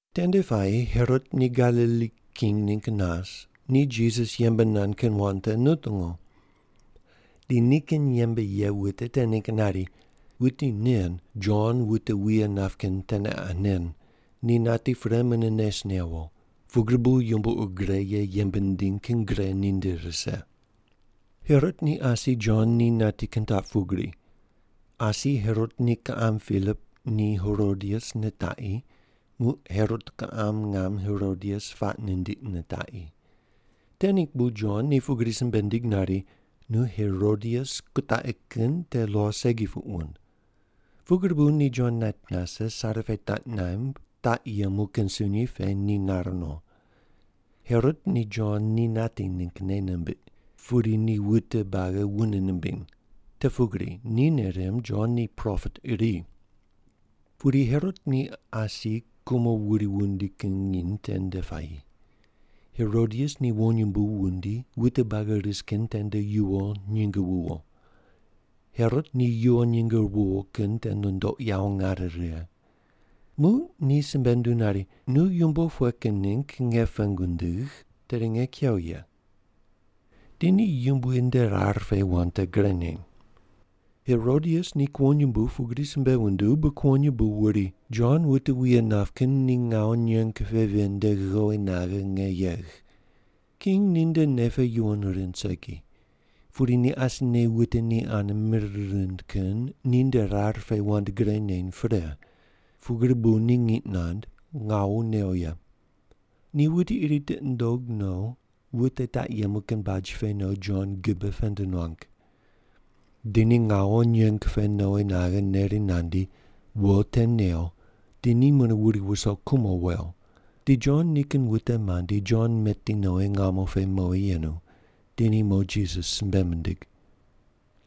Tende puayi Herot ni Galili king ningg nas, ni Jisas yembe nand kin wand te nutungu. Di nikin yembe ye wute te ningg nari, “Wuti nen, Jon wute wuye nap kin teneqa nen, ni nati pre mune nes newo, pugri bu yumbo ur gre ye yembe nindiny kin gre ninde rise.” Herot ni asi Jon ni nati kin taq pugri: Asi Herot ni kiqam Pilip ni Herodias nitaqi, muq Herot kiqam ngam Herodias puaq nindiq nitaqi. Te ningg bu Jon ni pugri simbe nindig nari, “Nu Herodias kutaqi kin te lo segi puq wund.” Pugri bu ni Jon nait nase, sare pe taq naimb, taq yemu kin sunyi pe ni nar no. Herot ni Jon ni nati ningg nei nimbiq, pudi ni wute buagi wune nimbiny, te pugri ni nei rimb Jon ni propet iri. Pudi Herot ni asi kumo wuri wundi kin nginy tende puayi. Herodias ni wonyumbu wundi wute buagi ris kin tende yuwo nyinge wuwo. Herot ni yuwo nyinge wuwo kin te nundoq yawo nare righe. Muq ni simbe nunduw nari, “Nu yumbo pughe kin ningg nge pengu ndigh, tedi nge kew ye.” Di ni Yumbui nde rar pe wand te gre neny. Herodias ni kuwonyumbu pugri simbe wunduw bu kuwonyumbu wuri, “Jon wute wuye nap kin ni ngawu nyeng pe ven nde ghowi naghe nge yegh.” King ninde nei pe yuwon rind segi. Pudi ni asine wute ni ane mir rind kin ni nde rar pe wand gre neny pre, pugri bu ni ngiq nand, ngawu new ye. Ni wuti iri tiqi nundog no wute taq yemu kin baj pe no Jon gibe pend nuang. Di ni ngawu nyeng pe nowi naghe neri nandi, wo te new di ni mune wuri wuso kumo wew. Di Jon nikin wute mandi, Jon meti nowi ngamo pe mowi yenu, di ni mo Jisas simbe mindig.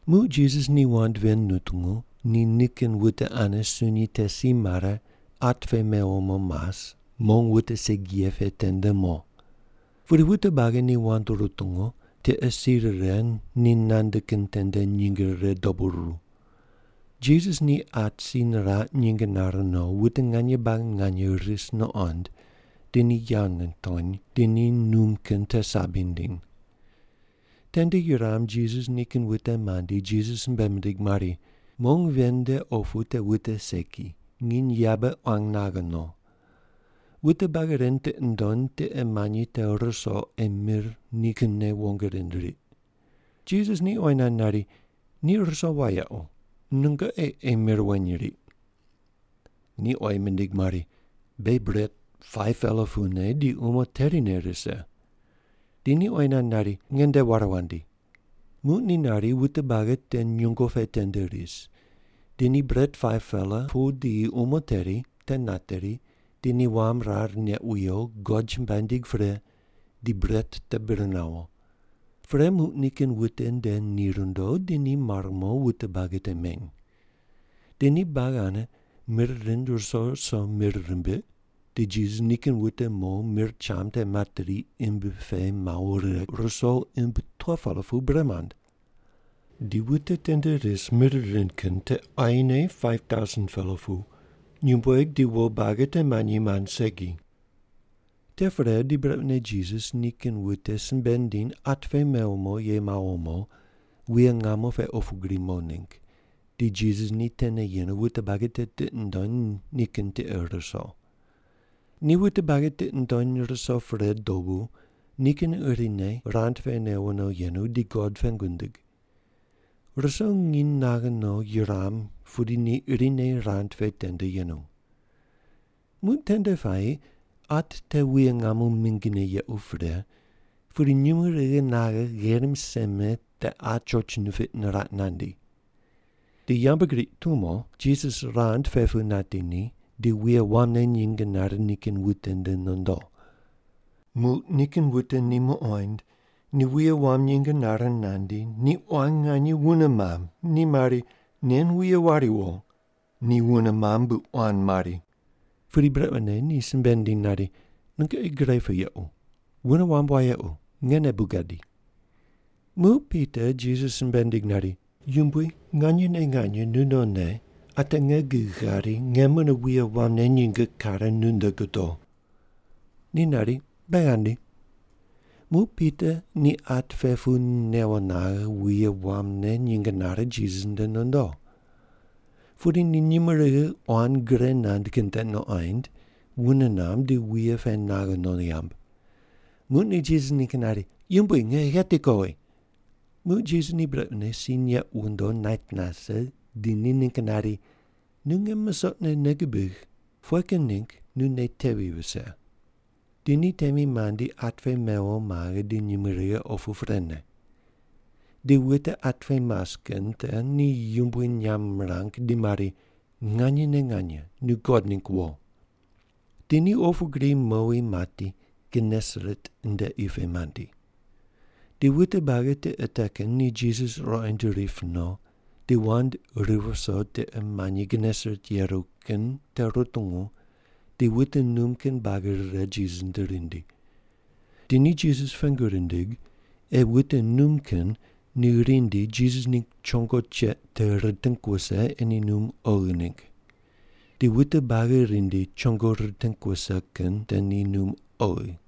Muq Jisas ni wand ven nutungu, ni nikin wute ane sunyi te si mare, at pe mewo mo mas, mong wute segi ye pe tende mo. Pudi wute buagi ni wand rutungu, tiqe si rire ni nande kin tende nyinge rire dobu ruru. Jisas ni at si niraq nyinge nare no, wute nganye buagi nganye ris nuqond di ni yawo nitony, di ni num kin te sabi nindiny. Tende yuram Jisas nikin wute mandi, Jisas simbe mindig mari, “Mong ven nde opu te wute segi, nginy yabe quan naghe no. Wute buagi ren tiqi ndony tiqe manyi te ruso ei mir ni kinne wong rind riq.” Jisas ni oyi nand nari, “Ni ruso wayequ, nungoqi ei mir weny riq.” Ni oyi mindig mari, “Beghi bret 5-pela pune di umo terine rise.” Di ni oyi nand nari, “Nge nde ware wandi.” Muq ni nari wute buagi te nyungo pe tende ris, di ni bret 5-pela pu di umo teri te nateri, di ni wam rar neq wiyo, God chumbuai nindig pre di bret te bir nawo. Pre muq nikin wute nde ni rundo, di ni mare mo wute buagi te meny. Di ni buagi ane mir rind ruso ruso mir rimbiq, di Jisas nikin wute mo mir cham te materi imbi pe mawo righe ruso imbi 12-pela pu bre mand. Di wute tende ris mir rind kin te quayine 5,000-pela pu, nyumbueg di wo buagi te manyi mand segi. Te pre di brequne Jisas nikin wute simbe nindim at pe mewo mo ye mawo mo, wuye ngamo pe opu gri mo ningg, di Jisas ni tene yenu wute buagi te tiqi nundony nikin tiqe ruso. Ni wute buagi tiqi nundony ruso pre dobu nikin irine rand pe newo no yenu di God pengu nindig. Ruso nginy naghe no yuram pudi ni irine rand pe tende yenu. Muq tende puayi at te wuye ngamo mingine yequ pre, pudi nyumurighi naghe gherim seme te at choch nipiq niraq nandi. Di yambgriq tumo Jisas rand pe pu nati ni, di wuye wamne nyinge nare nikin wute nde nondo. Muq nikin wute ni muqoind, ni wuye wam nyinge nare nandi, ni quan nganye wune mamb, ni mari, “Nen wuye wariwo!” Ni wune mamb bu quan mari. Pudi brequne ni simbe nindim nari, “Nungoqi gre pu yequ. Wune wamb wayequ, ngene bu gadi.” Muq Pita Jisas simbe nindig nari, “Yumbui, nganyene nganye nunonne ate nge gig ghari nge mune wuye wamne nyinge kare nunde godo.” Ni nari, “Be ghandi.” Muq Pita ni at pe pu newo naghe wuye wamne nyinge nare Jisas nde nondo. Pudi ni nyumurighi quan gre nand kin te nuqoind, wune namb, di wuye pe naghe no yamb. Muq ni Jisas ningg nari, “Yumbui, nge gheti kowi.” Muq Jisas ni brequne si neq wondo nait nase, di ni ningg nari, “Nu nge musoqne nei gubigh! Pughe kin ningg nu nei tevi vise?” Di ni temi mandi at pe mewo maghe, di nyumurighi opu prene. Di wute at pe mas kin te ni yumbui nyamb mirang di mari, “Nganyene nganye nu God ningg wo.” Di ni opu gri mowi mati, Genesaret nde qi pe mandi. Di wute buagi tiqe te kin ni Jisas ruqoind rip no, di wand ri viso tiqe manyi Genesaret yeru kin te rutungu di wute num kin buagi rire Jisas nde rindi. Di ni Jisas pengu rindig ei wute num kin ni rindi Jisas ningg chongo cheq te riting wuse ei ni num oghi ningg. Di wute buagi rindi chongo riting wuse kin te ni num oghi.